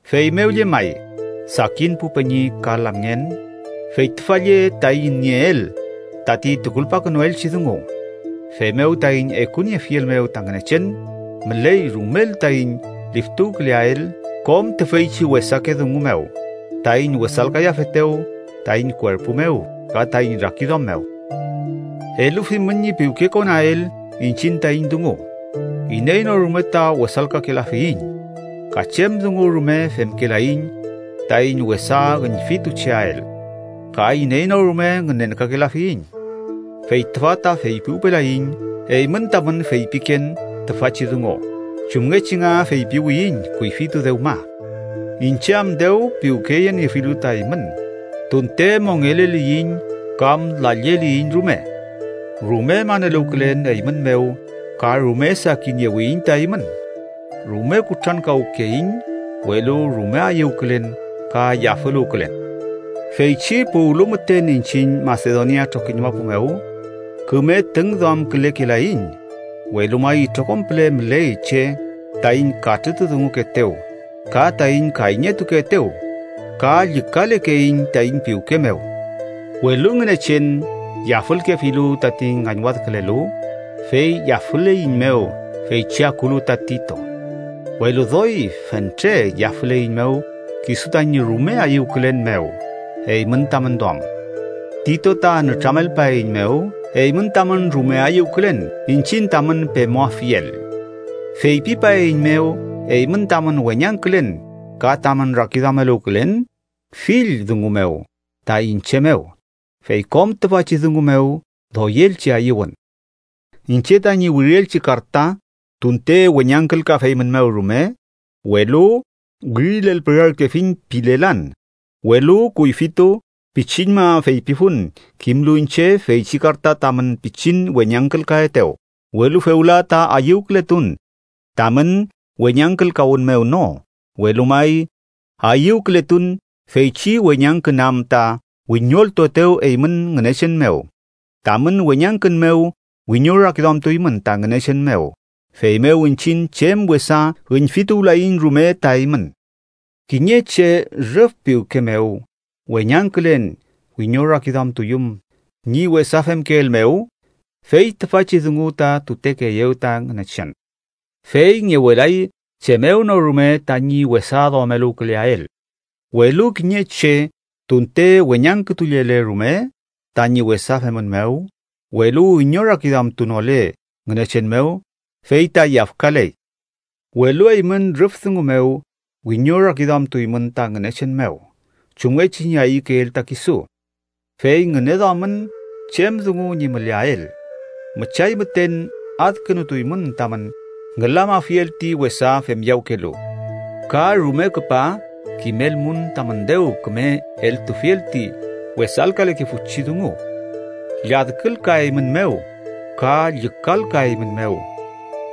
Feymew llemay, sakin pu peñi ka lamngen, fey tüfa lle taiñ nieel tati tukulpakünuelchi dungu. Feymew, taiñ ekuniefiel mew ta Ngünechen, müley rumel taiñ liftuwküleael kom tüfeychi wesake dungu mew taiñ wesalkayafetew taiñ kuerpu mew ka taiñ rakiduam mew. ¡Elufimün ñi piwkekonael iñchiñ taiñ dungu! Iney no rume ta wesalkakelafiyiñ, ka chem dungu rume femkelaiñ taiñ wesa üñfitucheael, ka iney no rume ngünenkakelafiyiñ. Fey tüfa ta feypiwpelayiñ eymün tamün feypiken tüfachi dungu, chumngechi nga feypiwiyiñ kuyfitu dewma, iñche am dew piwkeyeniefilu ta eymün, tunte mongeleliyiñ kam lalleliyiñ rume. Rume maneluwkülen eymün mew ka rume sakiniewiyiñ ta eymün. Rume kutrankawkeiñ, welu rume ayüwkülen ka yafüluwkülen. Feychi puwlu müten iñchiñ Masedonia trokiñ mapu mew, küme tüngduamkülekelaiñ, welu may itrokom püle müley che taiñ katrütudungukeetew ka taiñ kayñetukeetew, ka llükalekeiñ taiñ piwke mew. Welu Ngünechen yafülkefilu tati ngañwadkülelu, fey yafüleiñmew feychi akulu ta Tito. Welu doy fentre yafüleiñmew kisu tañi rume ayüwkülen mew eymün tamün duam. Tito ta nütramelpaeiñmew eymün tamün rume ayüwkülen iñchiñ tamün pemuafiel. Feypipaeiñmew eymün tamün weñangkülen ka tamün rakiduameluwkülen fill dungu mew ta iñche mew. Fey kom tüfachi dungu mew doyelchi ayüwün. Iñche tañi wirielchi karta tunte weñangkülkafeymünmew rume, welu wirilelpürarkefiñ pilelan, welu kuyfitu pichiñma feypifun kimlu iñche feychi karta tamün pichin weñangkülkaetew. Welu fewla ta ayüwkületun, tamün weñangkülkawün mew no, welu may ayüwkületun feychi weñangkün am ta wiñoltuetew eymün Ngünechen mew. Tamün weñangkün mew wiñorakiduamtuymün ta Ngünechen mew, feymew iñchiñ chem wesa üñfituwlayiñ rume ta eymün. Kiñe che rüf piwke mew weñangkülen wiñorakiduamtuyüm ñi wesa femkeel mew, fey tüfachi dungu ta tutekeeyew ta Ngünechen, fey ngewelay chem mew no rume tañi wesa duameluwküleael. Welu kiñe che tunte weñangkütullele rume tañi wesa femün mew, welu wiñorakiduamtunole Ngünechen mew, fey ta yafkaley. Welu eymün rüf dungu mew wiñorakiduamtuymün ta Ngünechen mew, chumngechi ñi ayükeel ta kisu. ¡Fey ngüneduamün chem dungu ñi müleael! Müchay müten adkünutuymün tamün ngülamafiel ti wesa femyawkelu. Ka rume küpa kimelmun tamün dew küme eltufiel ti wesalkalekefuchi dungu. Lladkülkaeymünmew ka llükalkaeymünmew.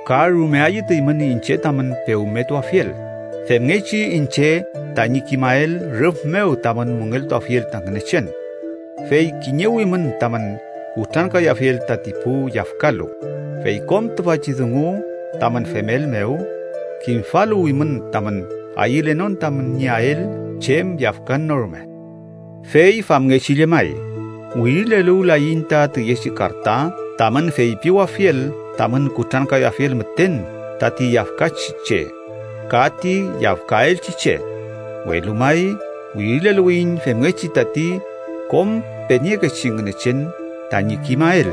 Ka rume ayütuymün iñche tamün pewmetuafiel, femngechi iñche tañi kimael rüf mew tamün müngeltuafiel ta Ngünechen. Fey kiñewimün tamün kutrankayafiel tati pu yafkalu. Fey kom tüfachi dungu tamün femel mew kimfaluwimün tamün ayülenon tamün nieael chem yafkan no rume. Fey famngechi llemay, wirileluwlayiñ ta tüyechi karta tamün feypiwafiel tamün kutrankayafiel müten tati yafkachi che ka tati yafkaelchi che. Welu may wirileluwiyiñ femngechi tati kom peniekechi Ngünechen tañi kimael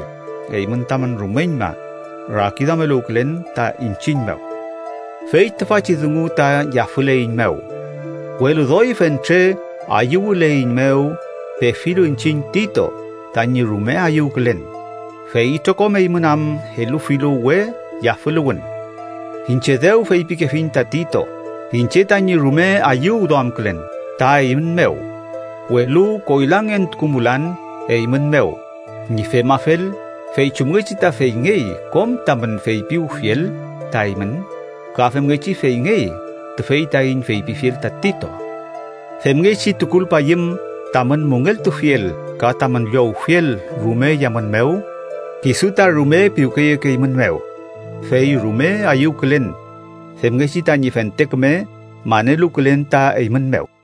eymün tamün rumeñma rakiduameluwkülen ta iñchiñ mew. Fey tüfachi dungu ta yafüleiñmew. Welu doy fentre ayüwüleiñmew, pefilu iñchiñ Tito tañi rume ayüwkülen, fey itrokom eymün am elufilu we yafüluwün. Iñche dew feypikefiñ ta Tito iñche tañi rume ayüwduamkülen ta eymün mew, welu koylangentukumulan eymün mew. Ñi femafel, fey chumngechi ta feyngey kom tamün feypiwfiel ta eymün ka femngechi feyngey tüfey taiñ feypifiel ta Tito. Femngechi tukulpayüm tamün müngeltufiel ka tamün llowfiel rume yamün mew, kisu ta rume piwkeyekeeymünmew. Fey rume ayüwkülen femngechi tañi fente küme maneluwkülen ta eymün mew.